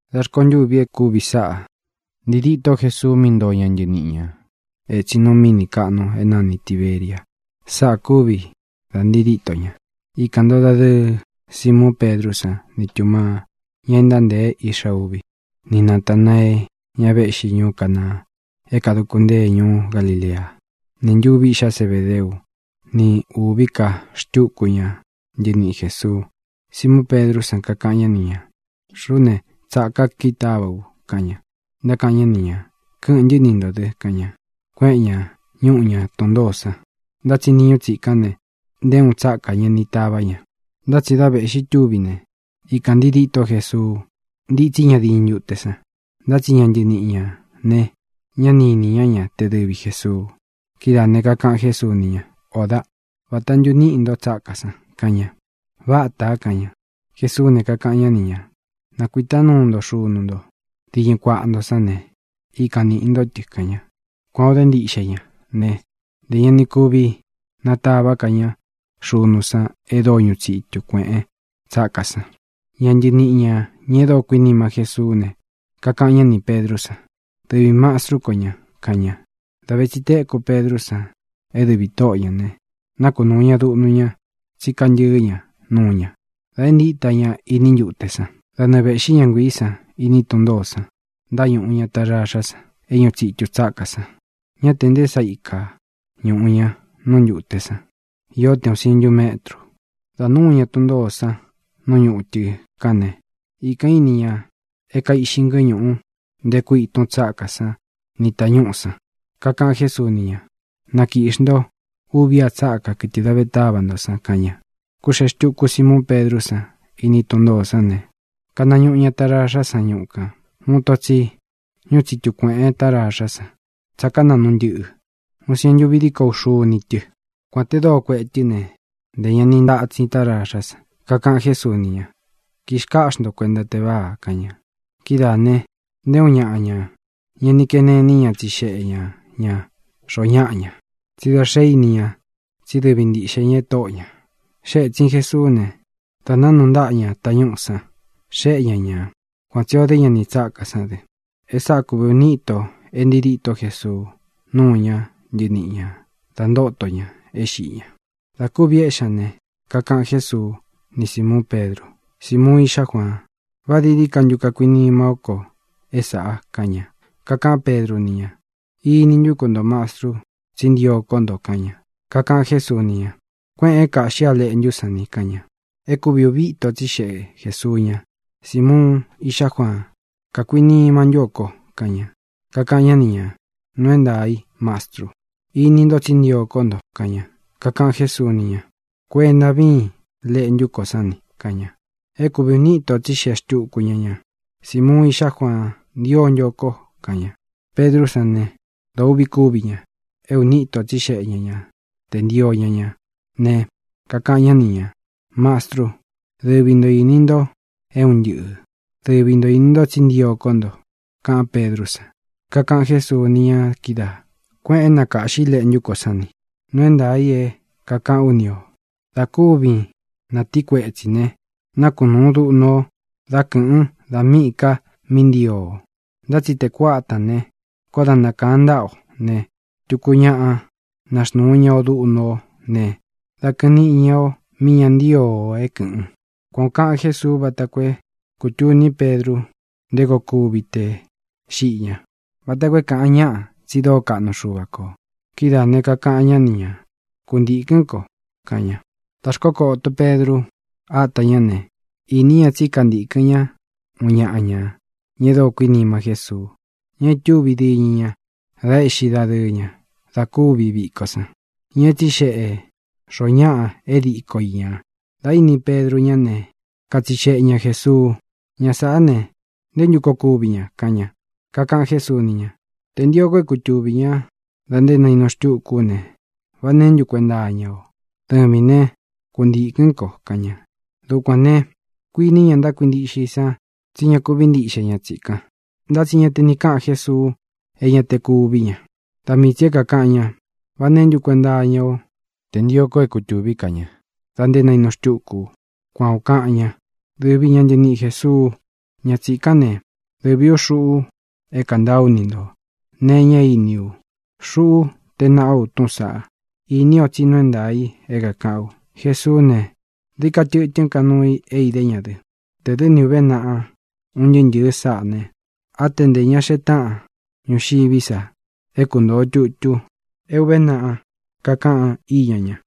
Dā rkontûvi e kúvi sáꞌa ntii dîtó Jesuu mí ntoo ña ntɨniꞌi ñā etsin nu míni kāꞌnu é nani Tīberia. Sáꞌā kúvī da ntii díto ña. Ikān ntoo dadɨɨ Simuun Pedrú san ni Tūmaa, ña e ntántēe Iꞌxa Uví, ni Natanāee, ña véꞌxi ñuú Canaa é kāduku ntée ñuú Galilea, nī ntuvi iꞌxá Zebedeu, ni ūví ka xtúku ña ntɨniꞌi Jēsuu. Simuun Pedrú san kakaꞌan ñá ni ñā: —Xuꞌú ne, tsāká kitáva u —kaꞌan ña. Ntákaꞌan ñá ni ñā: —Kɨ́ꞌɨ̄n ntɨ́ ni ntō dɨ —kaꞌan ña. Kuéꞌen ñā, ñuꞌú ña tun ntōó san. Ntá tsi niñu tsikán ne, nté uun tsákā ña ni tavá ña. Ntá tsi dā veꞌxi túvi ne, ikān ntii dîtó Jesuu, ntítsi ña diñɨ ntute san. Ntá tsi ña ntɨniꞌi ñā ne, ñá ni īni ñá te dɨvi Jēsuu. Kidáā ne, kakaꞌan Jésuu ni ña: —Ō dáꞌ, ¿vāta ntu níꞌi nto tsákā san? —kaꞌan ña. —Vátā —kaꞌan ña. Jesuú ne, kakaꞌan ñá ni ñā: —Nakuītá nuu nto xunu nto diñɨ kuáꞌa nto sán ne, ikan nīꞌi ntó tɨ —kaꞌan ña. Kuān o dé ntiꞌxe ña ne, ntē ña ni kuvi natavá ka ña xunu san e dóo ñuꞌu tsitu kuēꞌen tsákā san. Ña ntɨniꞌi ñā, ña e dóo kuinima Jésuú ne, kakaꞌan ñá nī Pedrú san: —¡Dɨvī mastru kó ña! —kaꞌan ña. Dā ve tsi téku Pedrú san é dɨvī Tóꞌo ñā ne, nákunūu ña duꞌnu ña, tsí kantɨɨ́ ña nuu ña, dā entíta ña iní ntute san. Da nɨɨ vēꞌxí ña nguiī sán iní tun ntōó san, ntáñuꞌu ña taraxá san é ñuꞌu tsitu tsákā san. Ñá te nté sa ikā ñuꞌu ña nú ntūte san; īó te ūun sientu métrū. Dā núu ña tun ntōó san nú ñutɨ kán ne, ikān íni ña é kaiꞌxi ngɨ́ñuꞌu, nteku ítun tsákā san ni tañúꞌū san. Kakaꞌan Jésuu ni ña: —Na kīꞌxi nto uvi a tsáka, kɨtɨ dā ve táva nto san —kaꞌan ña. Kūxee xtuku Simuun Pedrú san iní tun ntōó san ne, kanañuꞌu ña taraxá san ñuꞌu kān. Uun ito tsi ñúꞌu tsitu kuēꞌen taraxá san tsáka naꞌnu ntɨꞌɨ, uun sientu uvi díko uxuni tɨ. Kuān te dóo kueꞌe tɨ́ ne, ntē ña ni ntatsin táraxá san. Kakaꞌan Jésuu ni ña: —Kixkáꞌxi nto kuenta teváa —kaꞌan ña. Kidáā ne, nté uun ñaꞌa ña ña ni kene iní ña tsixeꞌe ña ñā xoo ñáꞌa ña, tsí da xé ini ña tsí dɨvi ntīꞌxe ña é Tóꞌo ñā. Xée ētsin Jesuú ne, dā nánuu ntáꞌa ña tañúꞌū sán, xeꞌé ña ña. Kuan tsī o dé ña nī tsákā sán dɨ. E sáꞌā kúvi ūni íto e ntii dîtó Jesuu núu ñá ntɨniꞌi ña dā ntóto ña é xiꞌi ña. Dā kuvi éꞌxi ña ne, kakaꞌan Jésuu ni Símuun Pedru: —Simuun, íꞌxá Juaan, ¿vā dií dií ka ntu kakuinima ó ko é sāꞌa? —kaꞌan ña. Kakaꞌán Pedru ni ña: —Ini ntú ku nto, Mastru, tsí ntio kó nto —kaꞌan ña. Kakaꞌan Jésuu ni ña: —Kuéꞌēn é kāꞌxí a leꞌntú ko sán ni —kaꞌan ña. É kūvi uvi íto tsixeꞌe Jēsuu ña: —Simuun, íꞌxá Juaan, ¿kakuinima ntú o ko? —kaꞌan ña. Kakaꞌan ñá ni ñā: —Nuu é ntaā i, Mastru. Ini nto tsí ntio kó nto —kaꞌan ña. Kakaꞌan Jésuu ni ña: —Kuenta víin leꞌntú ko sán ni —kaꞌan ña. É kūvi uni íto tsixeꞌe xtuku ña ñā: —Simuun, íꞌxá Juaan, ¿ntio ntu o ko? —kaꞌan ña. Pedrú san ne, dōo uꞌvi kúvi ña é uni íto tsixeꞌe ña ña tē ntío ña ña ne, kakaꞌan ñá ni ñā: —Mastru, dɨvi nto īni nto é un ntɨꞌɨ̄. Dɨvi nto īni nto tsí ntio kó nto —kaꞌán Pedrú san. Kakaꞌan Jésuu ni ña kídaā: —Kuéꞌēn é na kāꞌxi leꞌntú ko sán ni. Nuu é ntaā i é kākaꞌán u ni ō. Dā kúvin ñatīí kuetsī ne, nákunūun duꞌnu o dá kɨ̄ꞌɨn da míꞌī ka mí ntio o. Ntá tsi tē kuátān ne, koó da nakāan ntáꞌa o ne, tuku ñaꞌa naxnūu ña o duꞌnu ó ne, dá kɨ̄ꞌɨn niꞌi ña o míꞌī ña ntío o é kɨ̄ꞌɨn. Kuan ō kaꞌan Jésuu vata koo é kūtuní Pedru nté koo kuvi tē xiꞌi ña, vata koo é kāꞌan ñáꞌa tsi dóo kaꞌnu Xuva kō. Kidáā ne, kakaꞌan ñá ni ñā: —¡Kuntīkɨ́n ko! —kaꞌan ña. Dā xkókoto Pedru ata ñá ne, īní ña tsí kantīkɨ́n ña uun ñaꞌa ña, ña e dóo kuinima Jésuu, ña e itúvi diñɨ ña da éꞌxi dadɨɨ ña da kúvi viko san, ña é tsixeꞌe xoo ñáꞌa é diko i ñā. Dā íni Pedru ñá ne, katsixeꞌe ña Jēsuu: —Ña sāꞌá ne, ¿nté ntu koo kuvi ña? —kaꞌan ña. Kakaꞌan Jésuu ni ña: —Tē ntio ko é kutuvī ñá da nté nainu xtúku ú ne, ¿vá neē ntú kuenta iña o? ¡Dɨvīn né, kuntīkɨ́n ko! —kaꞌan ña. Dukuān ne, kuiní ña ntákuintiꞌxe i san tsí ña kuví ntiꞌxe ña tsikan. Ntá tsi ña te ni káꞌan Jésuu e ña te kuví ña. Da mii tsī é kākaꞌan ña: “¿Vá neē ntú kuenta iña ó te ntio ko é kutūví ka ña dā nté nainu xtúku u?”, kuan ō kaꞌan ña. Dɨvi ña ntɨniꞌi Jēsuu, ña tsikán ne, dɨvī ú xuꞌu é kantaa ú ni ntō nee iña e íni u. Xuꞌu tée naꞌá u túꞌūn saꞌa. Ini o tsí nuu é ntaā i é kākaꞌán u. Jesuú ne, dií ka tɨ̄tɨ́n ka nuu i é idé ña dɨ. Tē dɨ́ ni ūve naꞌa un ntɨɨ́ ntɨ̄ɨ sáꞌa ne, á te ntē ña xee táꞌan ñuxiví sa é kuntōo tutu é ūve naꞌa kakaꞌan íña ña.